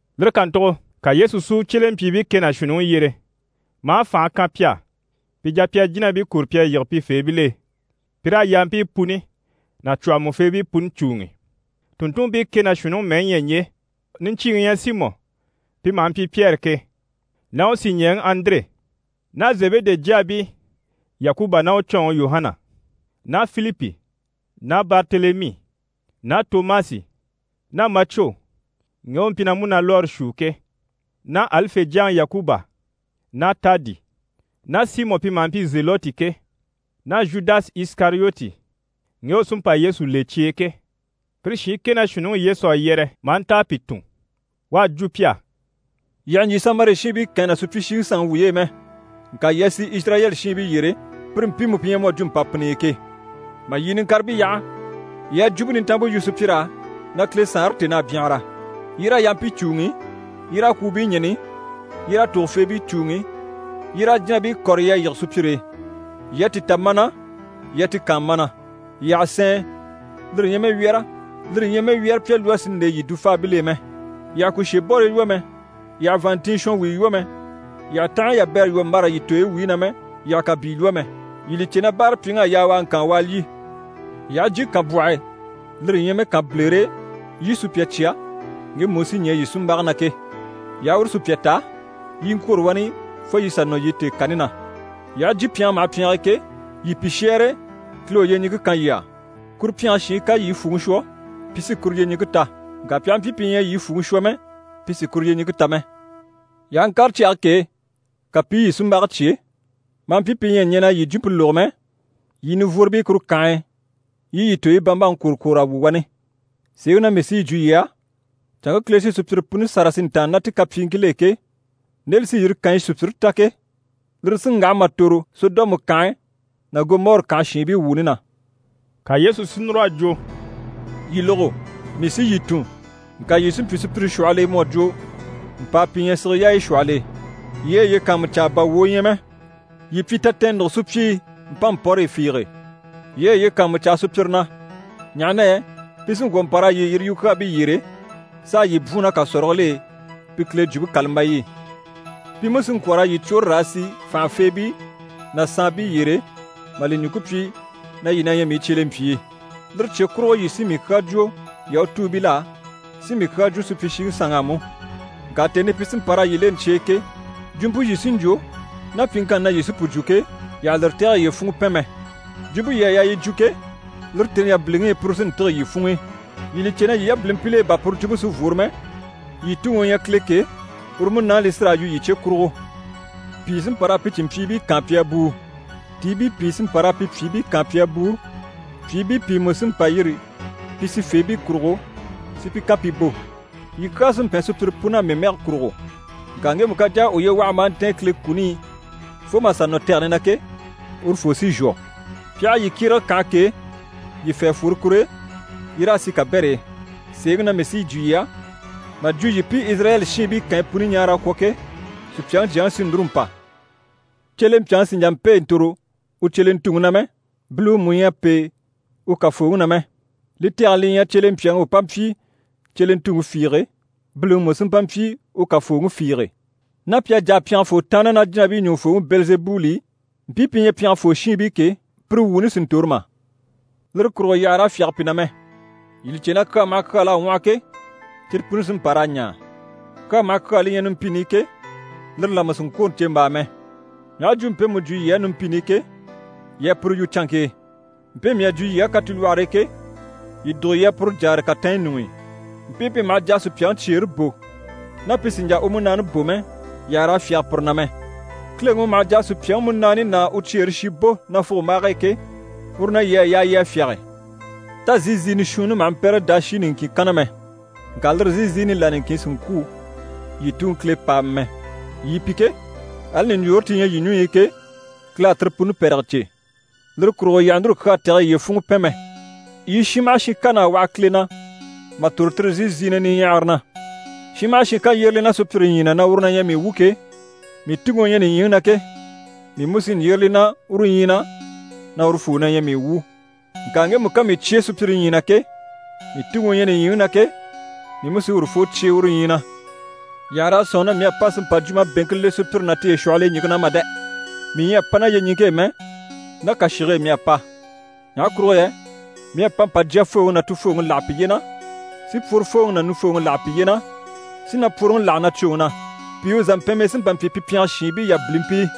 Lire kàntugo ka Yesu si u cyelempyiibii kɛ ná shuunniŋi yyere, maa fànhe kan pi á, pi jà pi a jínabii kɔ̀re pi a yige pifeebil'e, pi raa yampii puni ná cwɔ̀hɔmɔfeebii puni cùuŋi. Tùnntunmpii kɛ ná shuunniŋi mɛyi yi ɲyɛ ɲje: niɲcyiiŋi u ɲyɛ Simɔ pi maha mpyi Pyɛri ke, ná u sìɲɛɛŋi Andire ná Zebede jyaabii Yakuba ná u cɔɔnŋi Yuhana ná Filipi ná Baritelemi ná Tomasi ná Macwo ŋge u mpyi na múnalwɔɔre shuu ke, ná Alife jyaŋi Yakuba ná Taadi ná Simɔ pi maha mpyi Zelɔti ke, ná Zhudasi Isikariyoti ŋge u sí n‑pa Yesu le cye e ke. Pire shiin kɛ ná shuunniŋi Yesu à yɛrɛ maa nta a pi tun. U à jwo pi á: «Yii àha ɲjyè Samari shiinbii kànyi ná supyishiŋi sanŋi wuy'e mɛ, ŋka yii a sì Izirayɛli shiinbii yyére, pire mpiimu pi ɲyɛ mu à jwo mpàpinniyi ke. Mà yii niŋkaribii yaha, yii a Jwumpe Nintanmpe yu sùpyir'á na Kile Saanre tèn'à byanhara. Yii raa yampii cùuŋi, yii raa kwùubii ɲɛ̀ni, yii raa tògofeebii cùuŋi, yii raa jínabii kɔ̀re yii a yige sùpyire e. Yii à ti ta mana, yii a ti kaan mana. Yii àha sɛɛn, lire ɲyɛ mɛ wyɛ́rɛ, lire ɲyɛ mɛ wyɛ́rɛpya lwɔ́ si nde yii dufaabil'e mɛ. Yii àha kùshebɔrii lwɔ́ mɛ, yii àha vàanntinyɛ shɔnwuyo lwɔ́ mɛ, yii àha tanhaɲyi yabɛrɛ lwɔ́ mbâra yii tooyi wuyi na mɛ, yii àha kàbii lwɔ́ mɛ. Yii li cè na báarapyiŋ'à yaa u a ŋkaan u a lyî. Yii aha jyè kànbwɔh'e, lire ɲyɛ mɛ kànbilere e, yii sùpya cya ŋgemu u sí ɲɛɛ yii sunmbage na ke. Yii aha uru sùpya ta, yii i ŋkwôro wani fo yii sà nɔ yii tèekani na. Yii aha jyè pyɛngɛ maha pyɛng'e ke, yii pi shɛ́ɛre “Kile u yyeɲiŋke kan yii á.” Kuru pyɛnge shiin ká yii fwùŋi shwɔ, pi sí kuru yyeɲiŋke ta. Ŋka pi aha mpyi pi ɲyɛ a yii fwùŋi shwɔ mɛ, pi sì kuru yyeɲiŋke ta mɛ. Yii aha ŋkàre cyage k'e, ka pi i yii sunmbage cyé, maa mpyi pi ɲyɛ a ɲɛn'a yii jwumpe lógo mɛ, yii nivworobii kuru kànhe e, yii yii tooyi bambaŋi kwòro kwòr'a wu wani. Sèeŋi na mii sí yi jwo yii á, canŋke Kile sí sùpyire puni sâra si ntàanna ná ti kapyiiŋkil'e ke, nde li sí yire kànyi sùpyire ta ke, lire sí n‑waha mà tòro Sɔdɔmu kànhe ná Gɔmɔri kànhe shiinbii wuuni na.» Ka Yesu si núr'a jwo: «Yii lógo! Mii sí yii tun, ŋka yii sí n‑pyi sùpyire shwɔhɔl'e mu à jwo mpàa pi ɲyɛ sige yaaya shwɔhɔl'e. Yii a yiye kàanmucaa bà wwòo ɲyɛ mɛ, yii pyi tatɛɛnnugo sùpyii mpánmpɔrɔyɔ fiige. Yii a yiye kàanmucaa sùpyire na, ɲaha na yɛ pi sí n‑kwɔ̀ n‑pa raa yii yiri yukyaabii yyére, s'a yii bwùun ná kàsɔrigil'e pi Kile Jwumpe kàlambayi i. Pi mú sí n‑kwɔ̀ raa yii cwôre raa sì fànhafeebii ná saanbii yyére, mà li ɲùŋke pyi na yii na ɲyɛ mii cyelempyii. Lire cye kurugo yii sí mii kyaa jwo Yahutuubil'á, sí mii kyaa jwo supyishiŋi sanŋ'á mú. Ŋka tèni i pi sí n‑pa raa yii leni cye e ke, jwumpe yii sí n‑jwo, ná pyiŋkanni na yii sí pu jwo ke, yii àha lire tɛ̀gɛ yiye funŋɔ pɛn mɛ. Jwumpe yii à yaa yi jwo ke, lire tèni yabiliŋi i, puru sí n‑tîge yii funŋ'i. Yii li cè na yii yabilimpil'e bà puru jwumpe sí n‑fworo mɛ, yii Tuŋi u ɲyɛ Kile ke, uru Munaani li sí raa yu yii cye kurugo. Pìi sí n‑pa raa pi cìnmpyiibii kaan pi a bùu, tiibii pìi sí n‑pa raa pi pyìibii kaan pi a bùu, pyìibii pìi mú sí n‑pa n‑yîri pi sifeebii kurugo si pi kan pi bò. Yii kyaa sí n‑pɛn sùpyire pun'á mii mɛge kurugo. Ŋka ŋgemu ká jà a uye waha maa ntɛ̀ɛn Kile kuni i fo mà sà nɔ tɛgɛni na ke, urufoo sí n‑shwɔ. Pi aha yii kyérege kànhe k'e, yii fê a fworo kur'e, yii raa sì kabɛr'e. Sèeŋi na mii sí yi jwo yii á, mà jwo yii pi Izirayɛli shiinbii kànyi puni ɲaara a kwɔ̀ ke, Supyaŋi Jyaŋi sí núru n‑pa. Cyelempyaŋi sì n‑jà n‑pêe n‑tòro u cyelentuŋi na mɛ, biliwe mú ɲyɛ a pêe u kàfooŋi na mɛ. Li tɛgɛni li ɲyɛ cyelempyaŋi u pa mpyi cyelentuŋi fiige, biliŋi mú sí mpa mpyi u kàfooŋi fiige. Ná pi à jà a pyɛngefoo tàanna ná jínabii ɲùŋufooŋi Bɛlizebuli i, mpii pi ɲyɛ pyɛngefoo shiinbii ke, pire wuuni sì n-tòro mà? Lire kurugo yii àha raa fyáge pi na mɛ. Yii li cè, kyaa maha kyaa l'à ŋwɔhɔ ke, cyire puni sí n‑pa raa ɲaa. Kyaa maha kyaa li ɲyɛ numpini i ke, lire là mú sì n‑kwôro ɲcèmbaa mɛ. Mii aha jwumpe mpemu jwo yii á numpini i ke, yii a puru yu canŋke e. Mpe mii à jwo yii á katilwɔhɔre e ke, yii dùgo yii a puru jáare katanɲyi ɲuŋ'i. Mpii pi maha jà a sùpyaŋi cyeere bò, ná pi sì n‑jà u múnaani bò mɛ, yii àha raa fyáge pire na mɛ. Kileŋi u maha jà a sùpyaŋi múnaani ná u cyeere shi bò nafugombaage e ke, uru na yii à yaa yii a fyáge. Tá zíiziinɛ shuunni maha mpɛ́rɛ daashi niŋkin kanna mɛ? Ŋka lire zíiziini là niŋkin sì n‑kwû yii Tuŋi Kile pàama mɛ. Yii pi ke, ali ɲùɲjoore ti ɲyɛ yii ɲùɲyi i ke, Kile à tire puni pɛ̀rɛgɛ cè. Lire kurugo yii àha núru kyaa tɛ̀gɛ yii yiye funŋɔ pɛn mɛ! Yii shin maha shin kan'à waha Kile na mà tòro tire zíiziinɛ niɲyahara na. Shin maha shin ká yyére li na sùpyire ɲyii na na uru na ɲyɛ mii wu ke, mii Tuŋi u ɲyɛ nìɲyiŋi na ke, mii mú sí n‑yyére li na uru ɲyii na na urufoo na ɲyɛ mii wu. Ŋka ŋgemu ká mii cyé sùpyire ɲyii na ke, mii Tuŋi u ɲyɛ nìɲyiŋi na ke, mii mú sí urufoo cyé uru ɲyii na. Yii àha raa sɔ̂nŋi na mii à pa si mpa jwumabeŋke le sùpyire ná tiye shwɔhɔl'e ɲìŋke na mà dɛ! Mii ɲyɛ a pa ná yyeɲiŋke e mɛ, ná kàshige e mii à pa. Ɲaha kurugo yɛ mii à pa mpa “jyafooŋi ná tufooŋi láha piye na, si pworofooŋi ná nufooŋi láha piye na, si napworoŋi láha nacwoŋi na. Pìi u zàmpɛnmii sí n‑pa n‑pyi pi pyɛngɛ shiinbii yabilimpii.”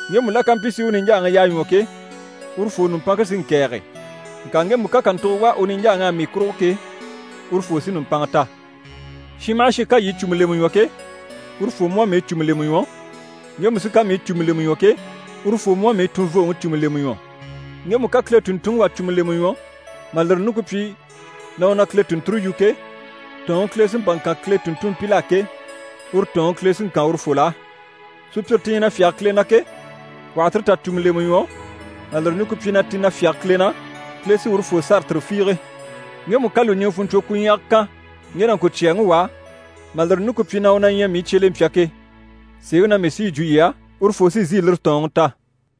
Ŋgemu la ká mpyi si u niɲjaaŋi yaa ɲwɔ ke, urufoo nùmpanŋke sí n‑kɛ̀ɛge, ŋka ŋgemu ká kàntugo wá u niɲjaaŋ'á mii kurugo ke, urufoo sí nùmpanŋa ta. Shin maha shin ká yii cùmu lemɛ ɲwɔ ke, urufoo mú à mii cùmu lemɛ ɲwɔ, ŋgemu sí ká mii cùmu lemɛ ɲwɔ ke, urufoo mú à mii tunvooŋi cùmu lemɛ ɲwɔ. Ŋgemu ká Kile tùnntunŋi wà cùmu lemɛ ɲwɔ, mà lire ɲùŋke pyi na u na Kile tùnnture yu ke, tɔ̀ɔnŋi Kile sí n‑pa n‑kan Kile tùnntumpil'á ke, uru tɔ̀ɔnŋi Kile sí n‑kan urufol'á. Sùpyire ti ɲyɛ na fyáge Kile na ke, wà ha tire tà cùmu lemɛ ɲwɔ, mà lire ɲùŋke pyi na ti na fyáge Kile na, Kile sí urufoo sâra tire fiige. Ŋgemu ká lùɲiŋɛ fùnɲcwokwuɲyaga kan ŋge nàŋkocyaaŋi wà á, mà lire ɲùŋke pyi na u na ɲyɛ mii cyelempya ke, sèeŋi na mii sí yi jwo yii á, urufoo sí n‑sìi lire tɔ̀ɔnŋi ta.»